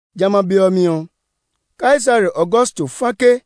Jamɛ a be ɔ mi ɔ, Kaisare Augusto fa ke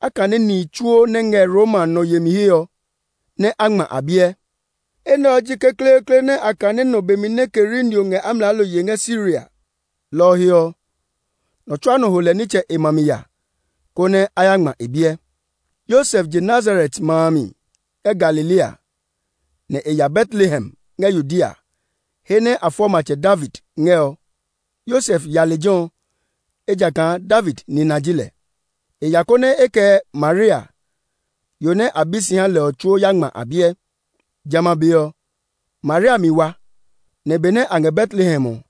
a kane nihi tsuo nɛ ngɛ Roma nɔ yemi he ɔ, nɛ a ngma a biɛ. Enɛ ɔ ji kekleekle nɛ a kane nɔ be mi nɛ Kerinio ngɛ amlaalo yee ngɛ Siria. Lɔ ɔ he ɔ, nɔ tsuaa nɔ ho lɛ nitsɛ e ma mi ya, konɛ a ya ngma e biɛ. Yosef je Nazaret ma a mi ngɛ Galilea, nɛ e ya Betlehem ngɛ Yudea, he nɛ a fɔ Matsɛ David ngɛ ɔ. Yosef ya lejɛ ɔ, ejakaa David nina ji lɛ. E ya, konɛ e kɛ Maria, yo nɛ a bi si ha lɛ ɔ tsuo nɛ a ya ngma a biɛ. Jamɛ a be ɔ, Maria mi wa, nɛ benɛ a ngɛ Betlehem ɔ,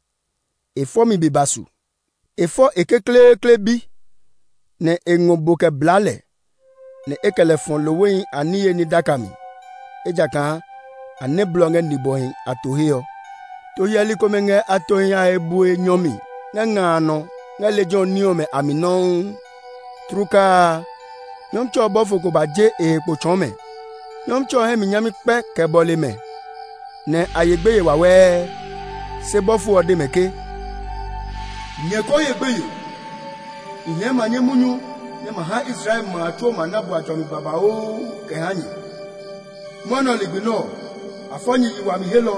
e fɔmi be ba su. E fɔ e kekleekle bi, nɛ e ngɔ bo kɛ blaa lɛ, nɛ e kɛ lɛ fɔ lohwehi a niye ní daka mi; ejakaa a nɛ blɔ ngɛ nibwɔhi a to he ɔ. To hyɛli komɛ ngɛ a tohi a he bue nyɔ mi ngɛ nga a nɔ ngɛ lejɛ ɔ ní ɔmɛ a mi nɔuu. Tlukaa a, Nyɔmtsɛ ɔ bɔfo ko ba je e he kpo tsɔɔ mɛ. Nyɔmtsɛ ɔ hɛ mi nyami kpɛ kɛ bɔle mɛ, nɛ a ye gbeye wawɛɛ. Se bɔfo ɔ de mɛ ke, “Nyɛ ko ye gbeye! I hɛɛ manye munyu nɛ ma ha Israel ma a tsuo ma na bua jɔmi babauu kɛ ha nyɛ. Mwɔnɛ ligbi nɛ ɔ, a fɔ nyɛ yi wami helɔ,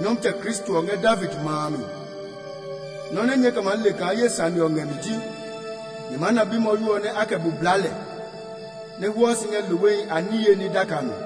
Nyɔmtsɛ Kristo ɔ ngɛ David ma a mi! Nɔ́ nɛ nyɛɛ kɛ maa le kaa ye sane ɔ ngɛ mi ji nyɛ maa na bimwɔyo nɛ a kɛ bo blaa lɛ, nɛ hwɔɔ si ngɛ lohwehi a niye ní daka mi.”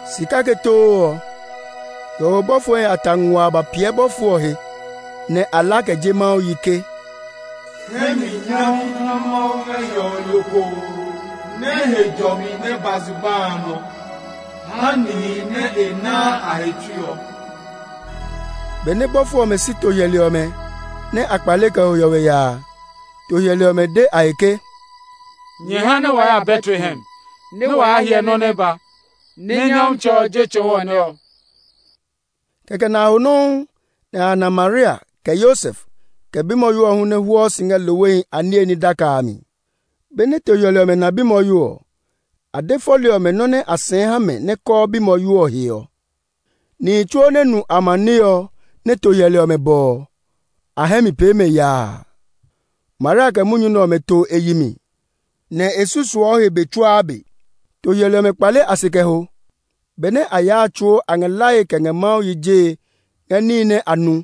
Si kake too ɔ, hiɔwe bɔfohi a ta nguaa ba piɛ bɔfo ɔ he, nɛ a la kɛ je Mawu yi ke, “Hɛ mi nyami ha Mawu ngɛ hiɔwe lokoo, nɛ he jɔmi nɛ ba zugba a nɔ ha nihi nɛ e naa a he tsui ɔ!” Benɛ bɔfo ɔmɛ si to hyɛli ɔmɛ, nɛ a kpale kɛ ho hiɔwe ya a, to hyɛli ɔmɛ de a he ke, “Nyɛ ha nɛ waa ya Betlehem, nɛ wa ya hyɛ nɔ́ nɛ ba, nɛ Nyɔmtsɛ ɔ je tsɔɔ wɔ nɛ ɔ.” Kɛkɛ nɛ a ho nɔuu, nɛ a ya na Maria, kɛ Yosef, kɛ bimwɔyo ɔ hu nɛ hwɔɔ si ngɛ lohwehi a niye ní daka a mi. Benɛ to hyɛli ɔmɛ na bimwɔyo ɔ, a de fɔli ɔmɛ nɔ́ nɛ a sɛɛ ha mɛ nɛ kɔɔ bimwɔyo ɔ he ɔ. Nihi tsuo nɛ nu amaniɛ ɔ nɛ to hyɛli ɔmɛ bɔ ɔ, a hɛ mi pee mɛ yaa. Maria kɛ munyu nɛ ɔmɛ to e yi mi, nɛ e susuɔ he be tsuaa be. To hyɛli ɔmɛ kpale a se kɛ ho. Benɛ a yaa a tsuo a ngɛ lae kɛ ngɛ Mawu yi jee ngɛ níhi nɛ a nu,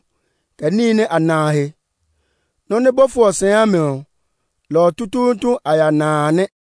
kɛ níhi nɛ a na a he. Nɔ́ nɛ bɔfo ɔ sɛɛ ha mɛ ɔ, lɔ ɔ tutuutu nɛ a ya na a nɛ.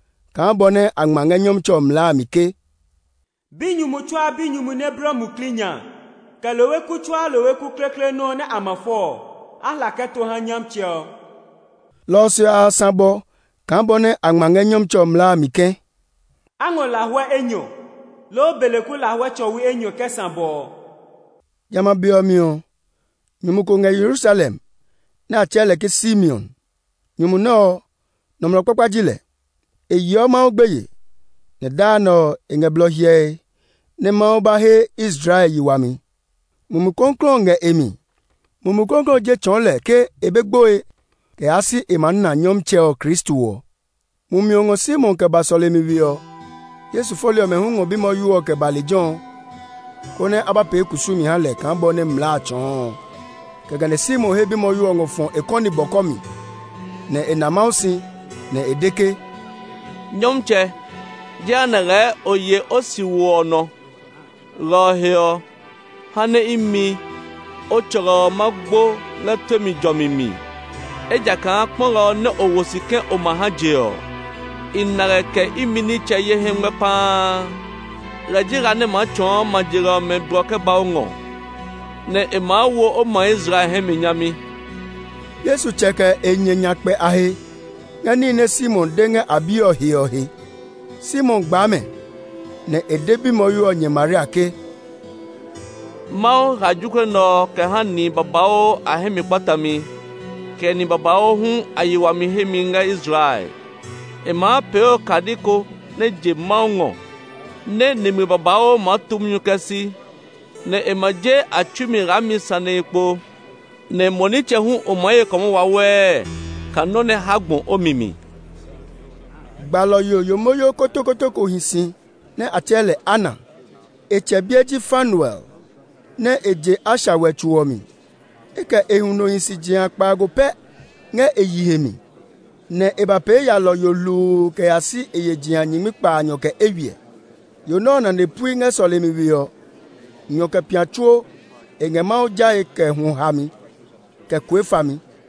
kaa bɔ nɛ a ngma ngɛ Nyɔmtsɛ ɔ mlaa a mi ke, “Binyumu tsuaa binyumu nɛ bliɔ muklii nya, kɛ lohwe ku tsuaa lohwe ku kekleekle nɔ́ nɛ a ma fɔ ɔ, a hla kɛ to ha Nyɔmtsɛ ɔ.” Lɔ ɔ se ɔ, a ya sã bɔ kaa bɔ nɛ a ngma ngɛ Nyɔmtsɛ ɔ mlaa a mi ke, “A ngɔ lahuɛ enyɔ, loo beleku lahuɛ tsɔwi enyɔ kɛ sã bɔ” ɔ. Jamɛ a be ɔ mi ɔ, nyumu ko ngɛ Yerusalem nɛ a tsɛɛ lɛ Simeon. Nyumu nɛ ɔ, nɔmlɔ kpakpa ji lɛ; e yeɔ Mawu gbeye, nɛ daa nɛ ɔ, e ngɛ blɔ hyɛe nɛ Mawu ba he Israel yi wami. Mumi Klɔuklɔu ɔ ngɛ e mi. Mumi Klɔuklɔu ɔ je tsɔɔ lɛ ke e be gboe kɛ yaa si e maa na Nyɔmtsɛ ɔ Kristo ɔ. Mumi ɔ ngɔ Simeon kɛ ba sɔlemi we ɔ. Yesu fɔli ɔmɛ hu ngɔ bimwɔyo ɔ kɛ ba lejɛ ɔ, konɛ a ba pee kusumi ha lɛ kaa bɔ nɛ mlaa a tsɔɔ ɔ. Kɛkɛ nɛ Simeon he bimwɔyo ɔ ngɔ fɔ e kɔni bɔkɔ mi, nɛ e na Mawu si, nɛ e de ke, “Nyɔmtsɛ, jehanɛ lɛɛ o ye o siwo ɔ nɔ; lɔ ɔ he ɔ, ha nɛ imi, o tsɔlɔ ɔ ma gbo ngɛ tue mi jɔmi mi. Ejakaa kpɔlɔ ɔ nɛ o wo si ke o ma ha je ɔ, i na lɛ kɛ imi nitsɛ ye hɛ ngmɛ paa. Lɛ ji la nɛ maa tsɔɔ ma je li ɔmɛ blɔ kɛ ba o ngɔ; nɛ e maa wo o ma Israel hɛ mi nyami.” Yesu tsɛ, kɛ e nyɛ a nya kpɛ a he ngɛ níhi nɛ Simeon de ngɛ a bi ɔ he ɔ he. Simeon gbaa mɛ, nɛ e de bimwɔyo ɔ nyɛ Maria ke, “Mawu hla jokuɛ nɛ ɔ kɛ ha nihi babauu a hɛ mi kpatami, kɛ nihi babauu hu a yi wami hemi ngɛ Israel. E maa pee okadi ko nɛ je Mawu ngɔ, nɛ́ nimli babauu maa tu munyu kɛ si; nɛ e ma je a tsui mi laami sanehi kpo. Nɛ mo nitsɛ hu o maa ye kɔmɔ wawɛɛ kaa nɔ́ nɛ ha gbɔ o mi mi.” Gbalɔ yo yomoyo kotokoto ko hi si nɛ a tsɛɛ lɛ Ana. E tsɛ biɛ ji Fanuel, nɛ e je Asher wɛtso ɔ mi. E kɛ e huno hi si jeha kpaago pɛ ngɛ e yihe mi, nɛ e ba pee yalɔyo hluu kɛ ya si e ye jeha nyingmi kpaanyɔ kɛ eywiɛ. Yo nɛ ɔ nane pui ngɛ sɔlemi we ɔ; nyɔ kɛ pia tsuo e ngɛ Mawu jae kɛ hwɔ hami, kɛ kue fami.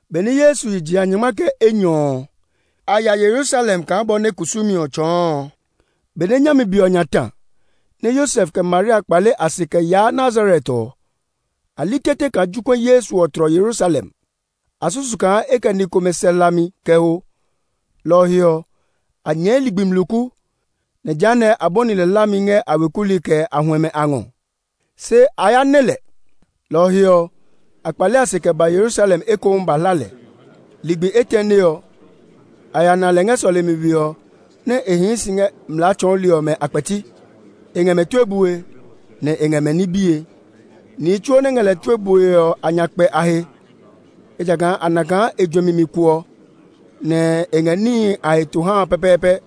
Benɛ Yesu ye jeha nyɔngma kɛ enyɔ ɔ, a ya Yerusalem kaa bɔ nɛ kusumi ɔ tsɔɔ ɔ. Benɛ nyami be ɔ nya ta, nɛ Yosef, kɛ Maria kpale a se kɛ yaa Nazaret ɔ, a li tete kaa jokuɛ Yesu ɔ tlɔ Yerusalem. A susu kaa e kɛ ni komɛ sɛ hlami kɛ ho, lɔ ɔ he ɔ, a nyɛɛ ligbi mluku, nɛ jehanɛ a bɔni lɛ hlami ngɛ a weku li, kɛ a huɛmɛ a ngɔ. Se a ya nɛ lɛ, lɔ ɔ he ɔ, a kpale a se kɛ ba Yerusalem ekohu ba hla lɛ. Ligbi etɛne ɔ, a ya na lɛ ngɛ sɔlemi we ɔ nɛ e hii si ngɛ mlaa tsɔɔli ɔmɛ a kpɛti; e ngɛ mɛ tue bue, nɛ e ngɛ mɛ ní bie. Nihi tsuo nɛ ngɛ lɛ tue bue ɔ a nya kpɛ a he; ejakaa a na kaa e juɛmi mi kuɔ, nɛ e ngɛ níhi a heto hae pɛpɛɛpɛ.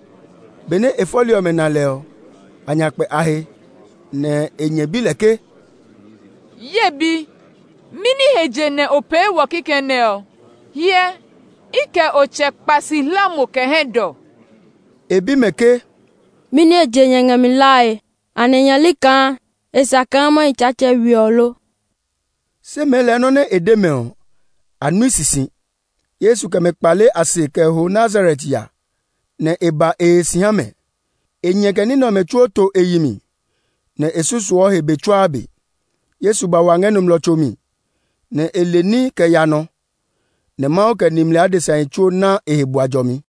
Benɛ e fɔli ɔmɛ na lɛ ɔ, a nya kpɛ a he; nɛ e nyɛ bi lɛ ke, “Ye bi, mɛni he je nɛ o pee wɔ kikɛ nɛ ɔ? Hyɛ, i kɛ o tsɛ kpa si hla mo kɛ hɛdɔ.” E bi mɛ ke, “Mɛni he je nyɛ ngɛ mi hlae? Anɛ nyɛ li kaa e sa kaa ma hi Tsaatsɛ we ɔ lo?” Se mɛɛ lɛɛ nɔ́ nɛ e de mɛ ɔ, a nui sisi. Yesu kɛ mɛ kpale a se kɛ ho Nazaret ya, nɛ e ba e he si ha mɛ. E nyɛ kɛ ní nɛ ɔmɛ tsuo to e yi mi, nɛ e susuɔ he be tsuaa be. Yesu ba wa ngɛ nɔmlɔ tso mi, nɛ e le ní kɛ ya nɔ. Nɛ Mawu kɛ nimli adesahi tsuo ná e he bua jɔmi.